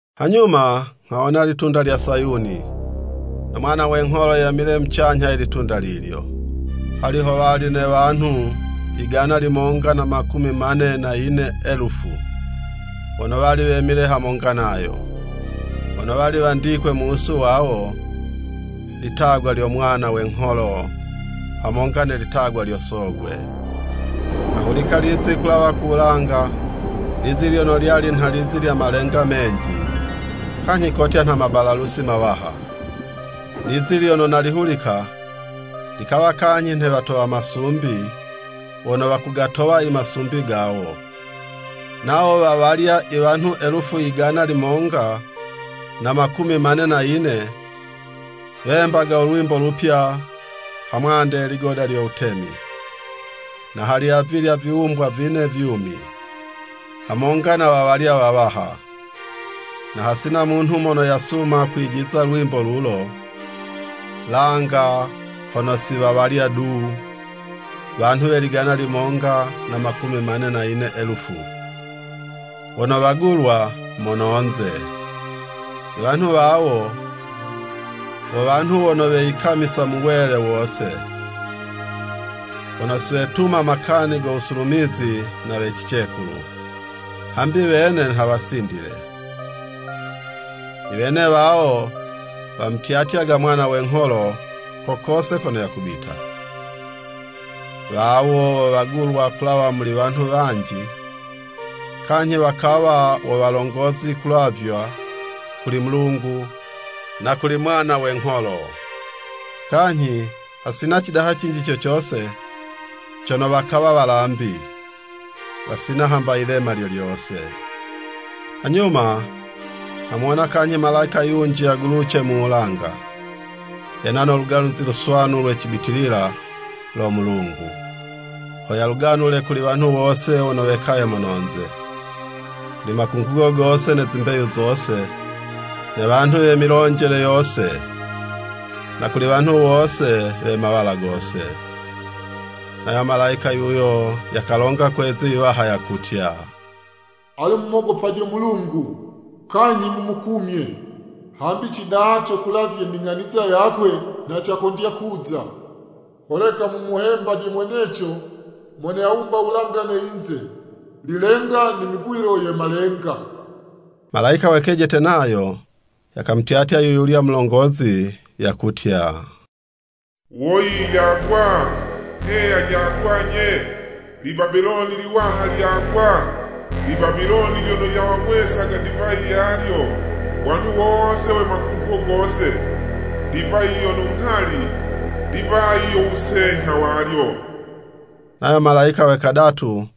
Hanyuma nghawona ilitunda lya Sayuni, no Mwana we ngholo yemile mucanyha ye litunda lilyo, hali howali ne wanhu yigana limonga na makumi mane na yine elufu, wono wali wemile hamonga nayo, wono wali wandikwe mu wusu wawo, litagwa lyo Mwana we ngholo hamonga ne litagwa lyo Sogwe. Nghahulika lizi kulawa ku wulanga, lizi lyono lyali nha lizi lya malenga menji kanyhi kotya nha mabalalusi mawaha. Lizi lyono nalihulika, likawa kanyhi nhe watowa masumbi wono wakugatowa i masumbi gawo. Nawo wa walya i wanhu elufu yigana limonga na mkumi mane na yine, wembaga u lwimbo lupya ha mwande ye ligoda lyo wutemi, na hali avilya viwumbwa vine vyumi, hamonga na wa walya wawaha. Na hasina munhu mono yasuma kwijiza lwimbo lulo, langa hono si wa walya du, wanhu we ligana limonga na makumi mane na yine elufu, wono wagulwa mononze. I wanhu wawo, wo wanhu wono weyikamisa mu wele wose, wono siwetuma makani go wusulumizi na we cicekulu, hambi wene nha wasindile. I wene wawo, wamutyatyaga Mwana we ngholo ko kose kono yakubita. Wawo wo wagulwa kulawa muli wanhu wanji, kanyhi wakawa wo walongozi kulavywa kuli Mulungu na kuli Mwana we ngholo. Kanyhi hasina cidaha cinji co cose cono wakawa walambi, wasina hamba yilema lyo lyose. Hanyuma nghamuwona kanyhi malayika yunji yaguluce mu wulanga, yena no Luganuzi Luswanu lwe cibitilila lo Mulungu, ho yaluganule kuli wanhu wose wono wekaye mono'nze, kuli makungugo gose, ne zimbeyu zose, ne wanhu we milonjele yose, na kuli wanhu wose we mawala gose. Nayo malayika yuyo, yakalonga kwe'zi yiwaha yakutya, “Ale mumogopajo Mulungu, kanyhi mumukumye! Hambi cidaha co kulavye ning'aniza yakwe, nha cakondya kuza. Holeka mumuhembaje mweneco mono yawumba wulanga ne yinze, lilenga ne mivwilo ye malenga.” Malayika we kejete nayo, yakamutyatya yu yulya mulongozi yakutya, “Woyi, lyagwa! Heya, lyagwa nye, li Babiloni liwaha lyagwa! Li Babiloni lyono lyawang'wesaga divayi yalyo, wanhu wose we makungugo gose, divayi yono nghali, divayi yo wusenyha walyo!” Nayo Malayika we kadatu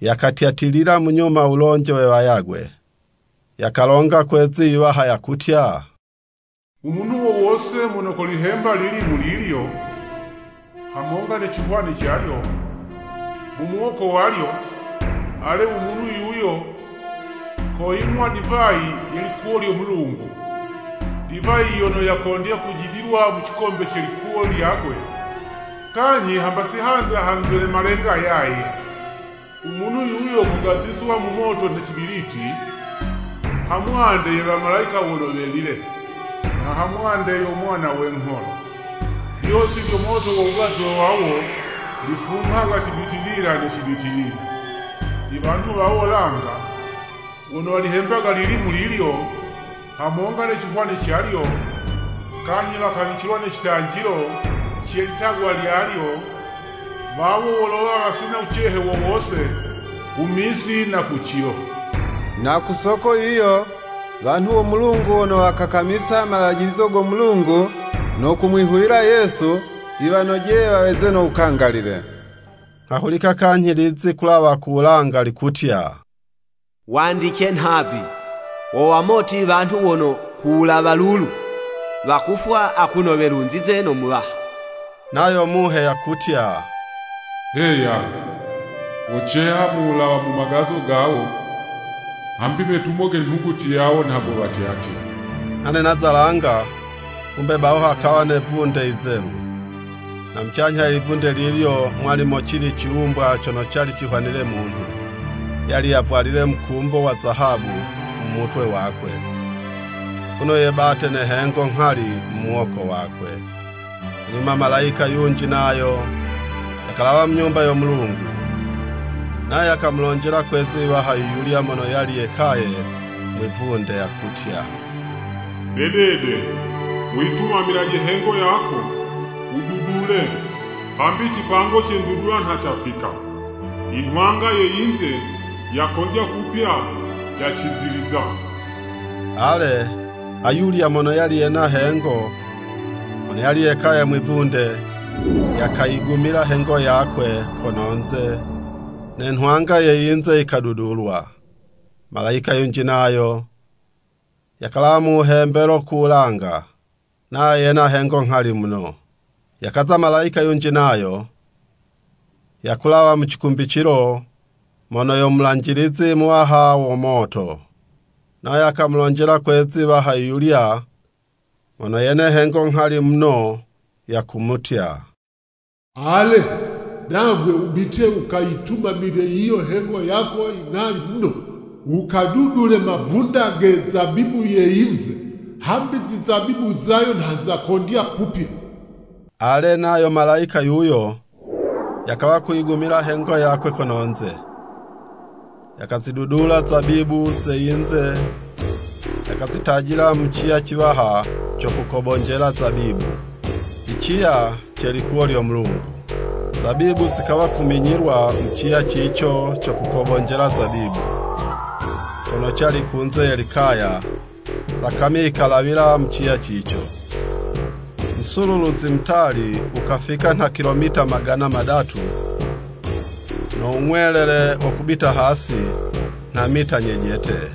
yakatyatilila munyuma wulonje we wayagwe, yakalonga kwe'zi yiwaha yakutya, “U munhu wo wose mono kolihemba lilimu lilyo, hamonga ne cihwani calyo, mu muwoko walyo, ale, u munhu yuyo, koying'wa divayi ye likuwo lyo Mulungu, divayi yono yakondya kujidilwa mu cikombe ce likuwo lyakwe, kanyhi hamba si hanza hanzwe ne malenga yaye. U munhu yuyo kogazizwa mu moto ne cibiliti, hamwande ye wamalayika wono welile na hamwande yo Mwana we ngholo.” Lyosi lyo moto wo wugazwe wawo, lifunghaga cibitilila ne cibitilila. I wanhu wawo langa wono walihembaga lilimu lilyo hamonga ne cihwani calyo, kanyhi wakawicilwa ne citanjilo ce litagwa lyalyo, wawo wolowa wasina wucehe wo wose ku misi na ku cilo. Na ku soko yiyo, wanhu wo Mulungu wono wakakamisa malajilizo go Mulungu no kumwihuwila Yesu, yiwanojeye waweze no wukangalile. Nghahulika kanyhi lizi kulawa ku wulanga likutya, “Wandice nhavi! Wo wamoti wanhu wono ku wulawa lulu, wakufwa akuno welunzize no Muwaha.” Nayo Muhe yakutya, “Heya! Woceha mu wulawa mu magazo gawo, hambi metumo ge nhuguti yawo nha gowatyatya.” Nane naza langa, kumbe baho hakawa ne 'vunde yizelu. Na mucanyha ye livunde lilyo mwali mocili ciwumbwa cono cali cihwanile munhu. Yali yavwalile mukumbo wa zahabu mu mutwe wakwe akuno yebate ne hengo nghali mu muwoko wakwe. Hanyuma malayika yunji nayo yakalawa mu Nyumba yo Mulungu, nayo yakamulonjela kwe'zi iwaha yu yulya mono yali yekaye mwi'vunde, yakutya, “Dedede, wuyitumamilaje hengo yako, wududule, hambi cipango ce ndudula nha cafika, i nhwanga ye yinze, yakondya kupya yaciziliza.” Ale, ayulya mono yali yena hengo, mono yali yekaye mwi'vunde, yakayigumila hengo yakwe kono'nze, ne nhwanga ye yinze yikadudulwa. Malayika yunji nayo yakalawa mu wuhembelo ku wulanga, nayo yena hengo nghali muno. Yakaza malayika yunji nayo, yakulawa mu cikumbicilo, mono yo mulanjilizi muwaha wo moto. Nayo yakamulonjela kwe'zi 'waha yu yulya mono yene hengo nghali muno, yakumutya, “Ale, nagwe wubite wukayitumamile yiyo hengo yako inghali muno, wukadudule mavunda ge zabibu ye yinze, hambi zizabibu zayo nha zakondya kupya!” Ale, nayo malayika yuyo, yakawa kuyigumila hengo yakwe kono'nze, yakazidudula zabibu ze yinze yakazitajila mu ciya ciwaha co kukobonjela zabibu, i ciya ce likuwo lyo Mulungu. Zabibu zikawa kuminyilwa mu ciya cico co kukobonjela zabibu, cono cali kunze ye likaya, sakami yikalawila mu ciya cico, musululuzi mutali wukafika nha kilometa magana madatu, no wung'welele wo kubita hasi nha mita nyejete.